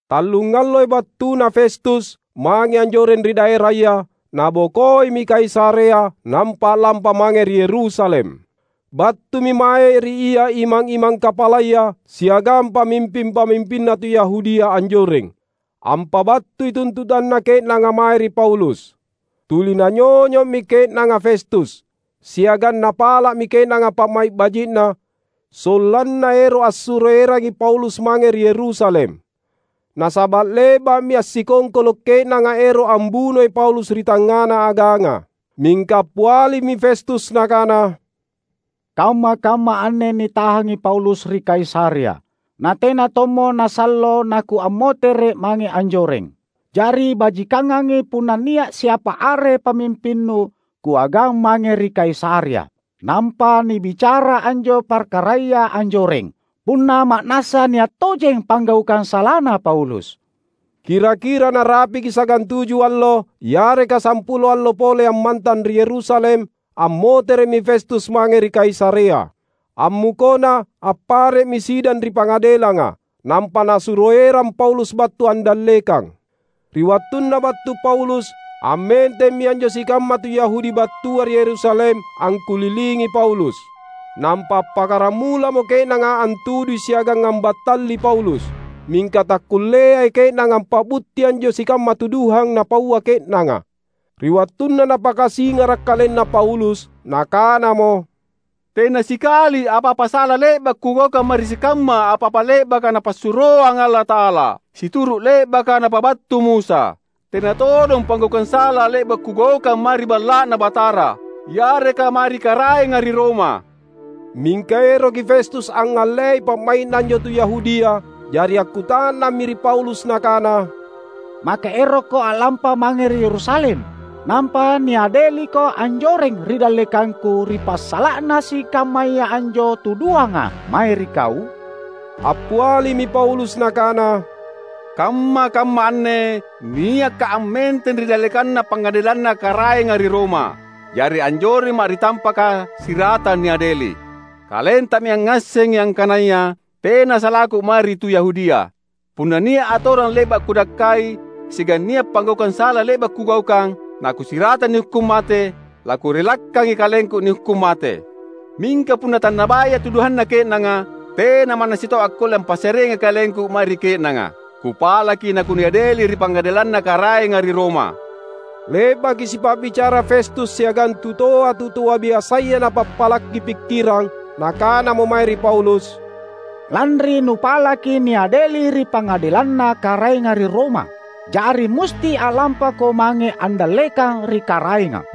Tallungalloi battuna Festus, mange anjoreng ri daeraya, nabokoimi Kaisarea nampa a’lampa mange ri Yerusalem. Battumi mae ri ia imang-imang kapalaya siagang pamimping-pamimpinna tu Yahudia anjoreng, ampabattui tuntutanna ke’nanga mae ri Paulus. Tuli nanyonyo’mi ke’nanga Festus, siagang napala’mi ke’nanga pa’mai’ baji’na, sollanna ero’ assuro erangi Paulus mange ri Yerusalem; nasaba’ le’ba’mi assikongkolo’ ke’nanga ero’ ambunoi Paulus ri tangngana aganga. Mingka appialimi Festus nakana, "Kamma-kamma anne nitahangi Paulus ri Kaisarea; natena tommo nasallo nakuammotere’ mange anjoreng. Jari, bajikangangi punna nia’ siapa are pamimpinnu kuagang mange ri Kaisarea nampa nibicara anjo parkaraya anjoreng, punna ma’nassa nia’ tojeng panggaukang salana Paulus." Kira-kira narapiki sagantuju allo yareka sampulo allo pole ammantang ri Yerusalem, ammotere’mi Festus mange ri Kaisarea. Ammukona appare’mi sidang ri pangadelanga, nampa nasuro erang Paulus battu andallekang. Ri wattunna battu Paulus, ammentemmi anjo sikamma tu Yahudi battua ri Yerusalem angkulilingi Paulus. Nampa appakkaramulamo ke’nanga antudui siagang ambattalli Paulus. Mingka takkulleai ke’nanga ampa’butti anjo sikamma tuduhang napaua ke’nanga. Ri wattunna napakasingara’ kalenna Paulus nakanamo, "Tena sikali apa-apa sala le’ba’ kugaukang mae ri sikamma apa-apa le’baka Napassuroang Allata’ala, situru’ le’baka napabattu Musa. Tena todong panggaukang sala le’ba’ kugaukang mae ri Balla’Na Batara, yareka mae ri Karaenga ri Roma." Mingka eroki Festus angngallei pa’mai’na anjo tu Yahudia. Jari akkuta’nammi ri Paulus nakana, "Maka erokko a’lampa mange ri Yerusalem nampa niadeliko anjoreng ri dallekangku ri passala’na sikammaya anjo tuduhanga mae ri kau?" Appialimi Paulus nakana, "Kamma-kamma anne niakka’ ammenteng ri dallekanna pangadelanna Karaenga ri Roma; jari anjoremma’ ri tampaka siratang niadeli. Kalentami angngassengi angkanaya tena salaku mae ri tu Yahudia. Punna nia’ atorang le’ba’ kudakkai siagang nia’ panggaukang sala le’ba’ kugaukang, nakusiratang nihukkung mate, lakurellakangi kalengku nihukkung mate. Mingka punna tannabaya tuduhanna ke’nanga, tena manna sitau akkulle ampassareangi kalengku mae ri ke’nanga. Kupalaki nakuniadeli ri pangadelanna Karaenga ri Roma!" Le’baki sipa’bicara Festus siagang tutoa-tutoa biasaya napappalaki pikkirang, nakanamo mae ri Paulus, "Lanri nupalaki niadeli ri pangadelanna Karaenga ri Roma, jari musti a’lampako mange andallekang ri Karaenga."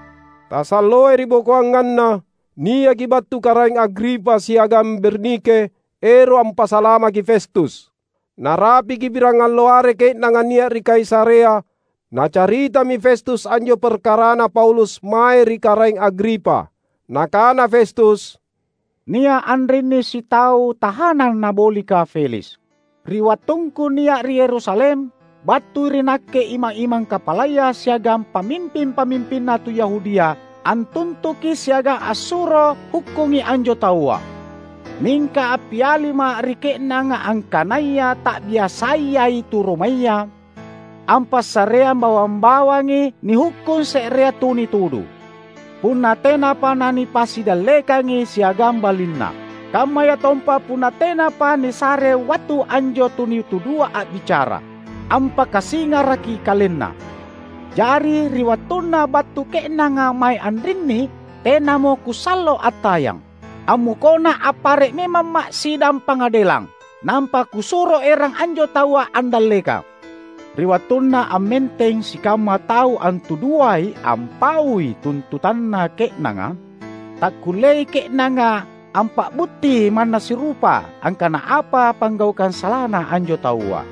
Tasalloai ribokoanganna, niaki battu Karaeng Agripa siagang Bernike ero’ ampasalamaki Festus. Narapiki pirangallo are ke’nanga nia’ ri Kaisarea, nacaritami Festus anjo parkarana Paulus mae ri Karaeng Agripa. Nakana Festus, "Nia’ anrinni sitau tahanang nabolika Feliks. Ri wattungku nia’ ri Yerusalem, battui ri nakke imang-imang kapalaya siagang pamimping-pamimpinna tu Yahudia antuntuki siagang ansuro hukkungi anjo taua. Mingka appialima’ ri ke’nanga angkanaya tabiasayai tu Romaya ampassareang bawang-bawangi nihukkung se’rea tu nitudu, punna tenapa nanipasidallekangi siagang balinna, kammayatompa punna tenapa nisarei wattu anjo tu nitudua a’bicara ampakasingaraki kalenna. Jari, ri wattunna battu ke’nanga mae anrinni tenamo kusallo attayang. Ammukona appare’ memamma’ sidang pangadelang, nampa kusuro erang anjo taua andallekang. Ri wattunna ammenteng sikamma tau antuduai ampaui tuntutanna ke’nanga, takkulleai ke’nanga ampa’butti manna sirupa, angkana apa panggaukang salana anjo taua.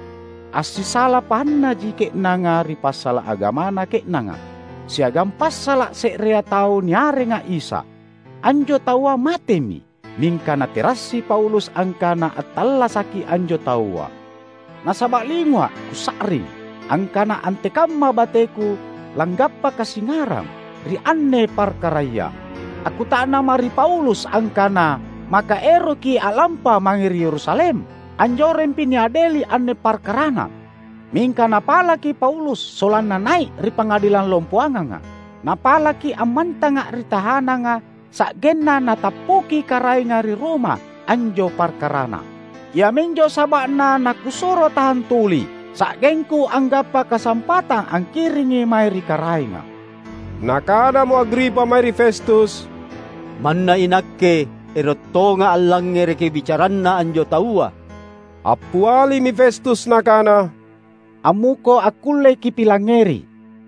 Assisala pahannaji ke’nanga ri passala’ agamana ke’nanga, siagang passala’ se’rea tau niarenga Isa. Anjo taua matemi mingka naterassi Paulus angkana attallasaki anjo taua. Nasaba’ lingua’ kusa’ring angkana antekamma bateku langgappa kasingarang ri anne parkaraya, akkuta’namma’ ri Paulus angkana maka eroki a’lampa mange ri Yerusalem. Anjorempi niadeli anne parkarana. Mingka napalaki Paulus sollanna nai’ ri pangadelang lompoanganga; napalaki ammantanga ri tahananga sa’genna natappuki Karaenga ri Roma anjo parkarana. Iaminjo saba’na nakusuro tahang tuli, sa’gengku anggappa kasampatang angkiringi mae ri Karaenga." Nakanamo Agripa mae ri Festus, "Manna inakke ero’ tonga’ allangngereki bicaranna anjo taua." Appialimi Festus nakana, "Ammuko akkullei kipilangngeri."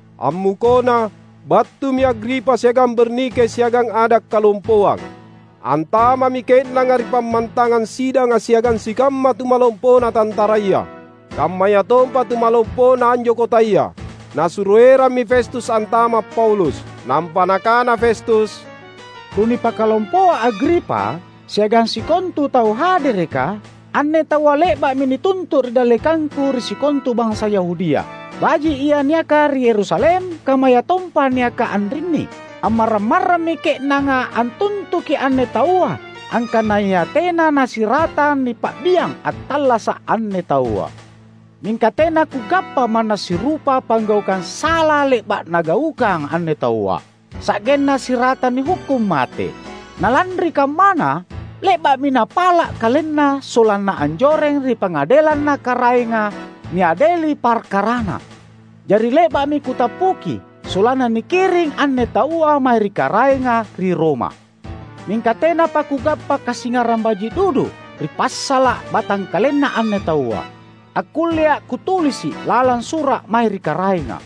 Ammukona, battumi Agripa siagang Bernike siagang ada’ kalompoang. Antama’mi ke’nanga ri pammantangang sidanga siagang sikamma tumalompona tantaraya, kammayatompa tumalompona anjo kotaya. Nasuro erammi Festus antama’ Paulus. Nampa nakana Festus, "Tunipakalompoa Agripa, siagang sikontu tau hadereka! Anne taua le’ba’mi nituntu’ ri dallekangku ri sikontu bansa Yahudia, baji’ ia niaka ri Yerusalem kammayatompa niaka anrinni. Ammarrang-marrammi ke’nanga antuntuki anne taua angkanaya tena nasiratang nipa’biang attallasa’ anne taua. Mingka tena kugappa manna sirupa panggaukang sala le’ba’ nagaukang anne taua, sa’genna siratang nihukkung mate. Na lanri kammana, le’ba’mi napala’ kalenna, sollanna anjoreng ri pangadelanna Karaenga niadeli parkarana. Jari le’ba’mi kutappuki sollanna nikiring anne taua mae ri Karaenga ri Roma. Mingka tenapa kugappa kasingarang baji’ dudu, ri passala’ batangkalenna anne taua, akkullea kutulisi’ lalang sura’ mae ri Karaenga.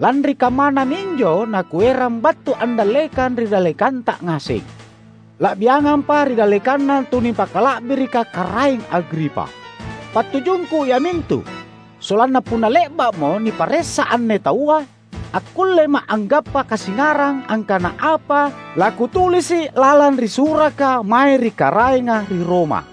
Lanri kammana minjo nakuerang battu andallekang ri dallekanta ngaseng, la’biangampa ri dallekanna tunipakala’birika Karaeng Agripa! Pattujungku iamintu, sollanna punna le’ba’mo niparessa anne taua, akkullema’ anggappa kasingarang angkana apa lakutulisi’ lalang ri suraka mae ri Karaenga ri Roma.